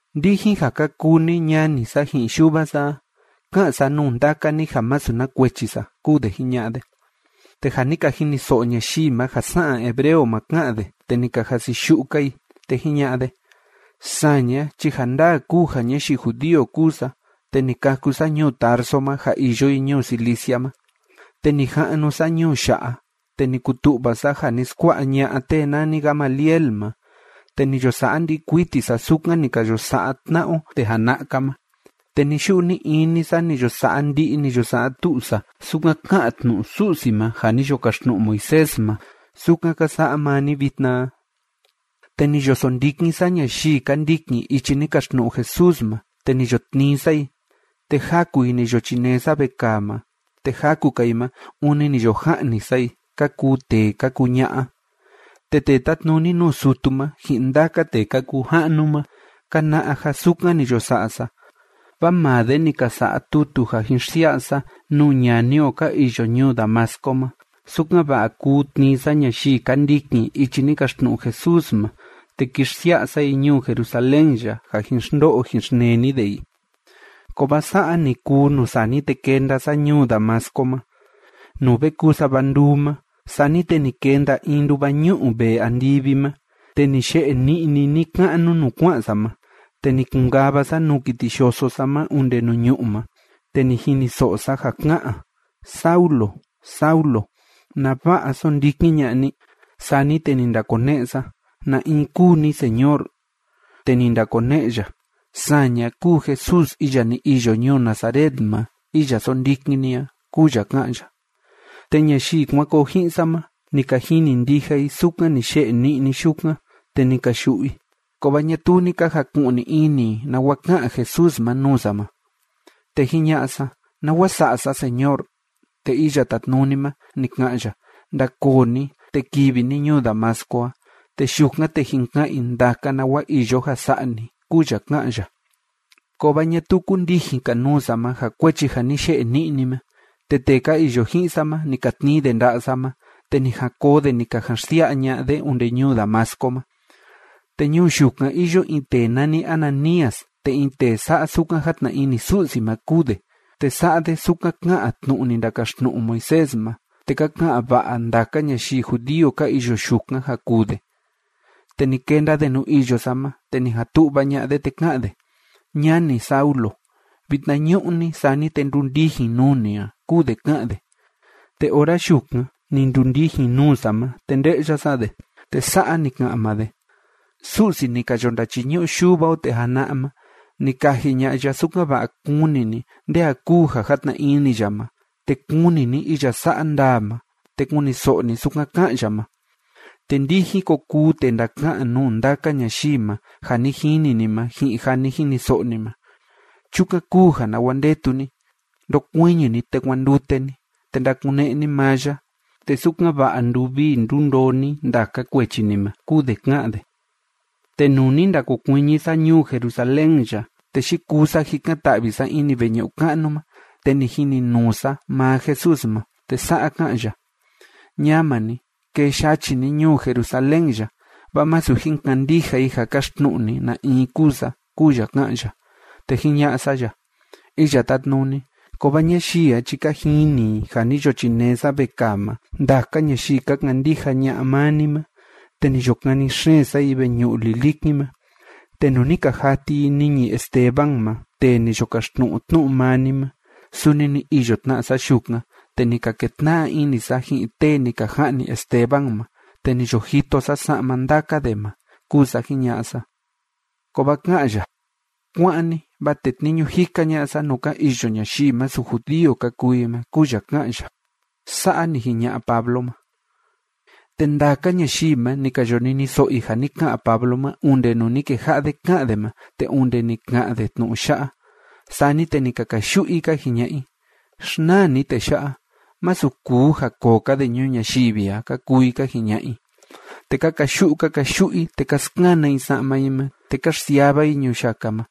―Ndijin ja ka kuu ni ñani sa ji'in yuva sa a, ká'an sa nuu ndaka ni ja masu na kuechi sa ―kúu de jiña'a de. Te ja ni ka jiniso'o ñayii ma ja sa'an hebreo ma ká'an de, te ni ka jasiyu'u‑ka i. Te jiña'a de: ―Saña chi ja ndaa kúu ja ñayii judío kúu sa, te ni kâku sa ñuu Tarso ma ja iyo i ñuu Cilicia ma, te ni ja'nu sa ñuu ya'a, te ni kutu'va sa ja ni skua'a ña'a tee nani Gamaliel ma, te ni yo sa'a ndi'i kuiti sa sukan ni ka yo sa'a tna'a o tee jana'a‑ka ma, te ni‑yu'u ni‑ini sa ni yo sa'a ndi'i, ni yo sa'a tu'u sa sukan ká'an tnu'u Su'si ma ja ni yo kaxtnu'u Moisés ma, sukan ka sa'a maa ni vitna a. Te ni yo sondikin sa ñayii ka ndikin ichi ni kaxtnu'u Jesús ma, te ni yo tnii sa i, te jaku i ni yo chinee sa vekaa ma, te jaku‑ka i ma, ûni ni yo ja'ni sa i, ka kuu tee ka kuu ña'a. Te tee tátnuni nuu sutu ma ji'in ndaka tee ka kuu ja'nu ma ka na'a ja sukan ni yo sa'a sa, vaa maa de ni ka sa'a tutu ja jin xsia'a sa nuu ñani o ka iyo ñuu Damasco ma, sukan‑va'a kuu tnii sa ñayii ka ndikin ichi ni kaxtnu'u Jesús ma, te ki xsia'a sa i ñuu Jerusalén ya, ja jin xndo'o jin xneni de i. Kovaa sa'a ni kuu nuu sani te kenda sa ñuu Damasco ma, nuu ve kuu sava nduu ma, sani te ni kenda in nduva ñu'u vee andivi ma, te ni ye'e ni'ni ni‑ka'nu nuu kua'an sa ma. Te ni kun‑kava sa nuu kiti yoso sa ma onde nuu ñu'ú ma, te ni jiniso'o sa ja ká'an: “Saulo, Saulo, ¿nava'a sóndikin ña'a ni?” Sani te ni ndakone'e sa: “¿Na in kúu ni, Señor?” Te ni ndakone'e ya: “Saña kúu Jesús iya ni iyo ñuu Nazaret ma iya sóndikin ni a”, kúu ya ká'an ya. Te ñayii kuan koo ji'in sa ma, ni ka jini ndija i sukan ni ye'e ni'ni yukan, te ni ka yu'u i, kovaa ñatuu ni ka jaku'ni ini i nawa ká'an Jesús ma nuu sa ma. Te jiña'a sa: “¿Nawa sa'a sa, Señor?” Te Iya Tátnuni ma, ni ka'an ya: “Ndakoo ni, te kivi ni ñuu Damasco a. Te yukan, te jin ka'an i ndaka nawa iyo ja sa'a ni”, kúu ya ká'an ya. Kovaa ñatuu kundijin‑ka nuu sa ma, ja kuechi ja ni ye'e ni'ni ma. Te tee ka iyo ji'in sa ma, ni ka tnii de nda'a sa ma, te ni jan koo de ni ka jan xsia'a ña'a de onde ñuu Damasco ma. ’Te ñuu yukan iyo in tee nani Ananías, te in tee sa'a sukan játna ini Su'si ma kúu de, te sa'a de sukan ká'an tnu'u ni ndakaxtnu'u Moisés ma, te ka ka'an va'a ndaka ñayii judío ka iyo yukan ja kuu de. Te ni kenda de nuu iyo sa ma, te ni jan tu'va ña'a de, te ká'an de: “Ñani Saulo, vitnañu'ni, sani te ndundijin nuu ni a”, kúu de ká'an de, te ora yukan ni ndundijin nuu sa ma, te nde'ya sa de. Te sa'a ni ka'an maa de: “Su'si ni ka yo ndachiñu'u yuva o tee jana'a ma, ni kaji ña'a ya, sukan‑va'a kuni ni nde a kúu ja játna ini ya ma, te kuni ni iya sa'a ndaa ma, te kuniso'o ni sukan ká'an ya ma. Te ndijin ko kuu tee ndaka'an nuu ndaka ñayii ma ja ni jini ni ma ji'in ja ni jiniso'o ni ma. Chukan kúu ja, ¿nawa ndetu ni? Ndokuiñi ni, te kuandute ni, te ndakune'e ni maa ya, te sukan‑va'a nduvii ndundoo ni ndaka kuechi ni ma”, kúu de ká'an de. ’Te nuu ni ndakokuiñi sa ñuu Jerusalén ya, te yikuu sa jikan‑ta'vi sa ini veñu'u ka'nu ma, te ni jininuu sa maa Jesús ma. Te sa'a ká'an ya: “Ñama ni, kee yachi ni ñuu Jerusalén ya, vaa masu jin kandija i ja kaxtnu'u ni na in kúu sa”, kúu ya ká'an ya. Te jiña'a sa ya: “Iya Tátnuni, kovaa ñayii a chi ka jini i ja ni yo chinee sa vekaa ma ndaka ñayii ka kandija ña'a maa ni ma, te ni yo kani xeen sa i veñu'u lilikin ma. Te nuu ni ka jati i niñi Esteban ma tee ni yo kaxtnu'u tnu'u maa ni ma, suni ni iyo tna sa yukan, te ni ka ketna'a ini sa ji'in tee ni ka ja'ni Esteban ma, te ni yo jito sa sa'ma ndaka de ma”, kúu sa jiña'a sa. Kovaa ká'an ya: “Kuá'an ni, vaa tetniñu jika ña'a sa nuu ka iyo ñayii masu judío ka kuu i ma”, kúu ya ká'an ya. ―Sa'a ni jiña'a Pablo ma. Te ndaka ñayii ma, ni ka yo niniso'o i ja ni ka'an Pablo ma onde nuu ni keja'a de ká'an de ma te onde ni ka'an de tnu'u ya'a. Sani te ni ka kayu'u i ka jiña'a i: ―Xnaa ni tee ya'a. Masu kuu ja koo‑ka de ñuu ñayivi a ―ka kuu i ka jiña'a i. Te ka kayu'u ka kayu'u i, te ka skana i sa'ma i ma, te ka xsiava i ñuyaka ma.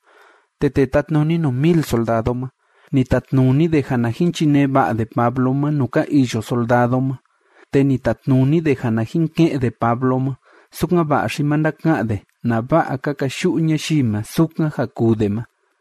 Te tee tátnuni nuu mil soldado ma, ni tatnuni de ja na jin chinee va'a de Pablo ma nuu ka iyo soldado ma, te ni tatnuni de ja na jin ke'en de Pablo ma, sukan‑va'a xi ma ndaka'an de nava'a ka kayu'u ñayii ma sukan ja kuu de ma.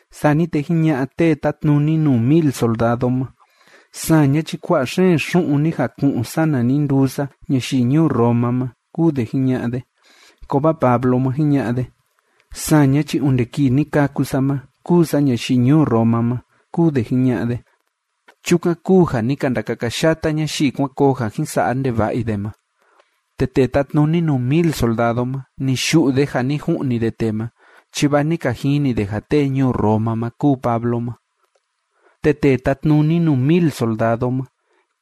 Sani te jiña'a tee tátnuni nuu mil soldado ma: ―Saña chi kua'a xeen xu'un ni jaku'un sana ni nduu sa ñayii ñuu Roma ma ―kúu de jiña'a de. Kovaa Pablo ma, jiña'a de: ―Saña chi onde kii ni kâku sa ma kúu sa ñayii ñuu Roma ma ―kúu de jiña'a de. Chukan kúu ja ni ka ndakakayata ñayii kuan koo ja jin sa'a ndeva'a i de ma, te tee tátnuni nuu mil soldado ma, ni yu'u de ja ni ju'ni de tee ma, chi vaa ni ka jini de ja tee ñuu Roma ma kúu Pablo ma. Te tee tátnuni nuu mil soldado ma,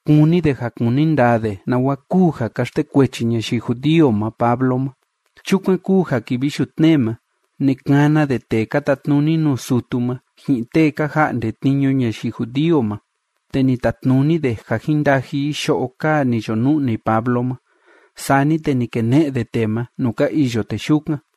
kúni de ja kuni ndaa de nawa kúu ja ka xtekuechi ñayii judío ma Pablo ma. Chukan kúu ja kivi yutnee ma, ni kana de tee ka tatnuni nuu sutu ma, ji'in tee ka ja'nde tniñu ñayii judío ma, te ni tatnuni de ja jín ndaji i yo'o kaa ni yo nu'ni Pablo ma, sani te ni kene'e de tee ma nuu ka iyo tee yukan.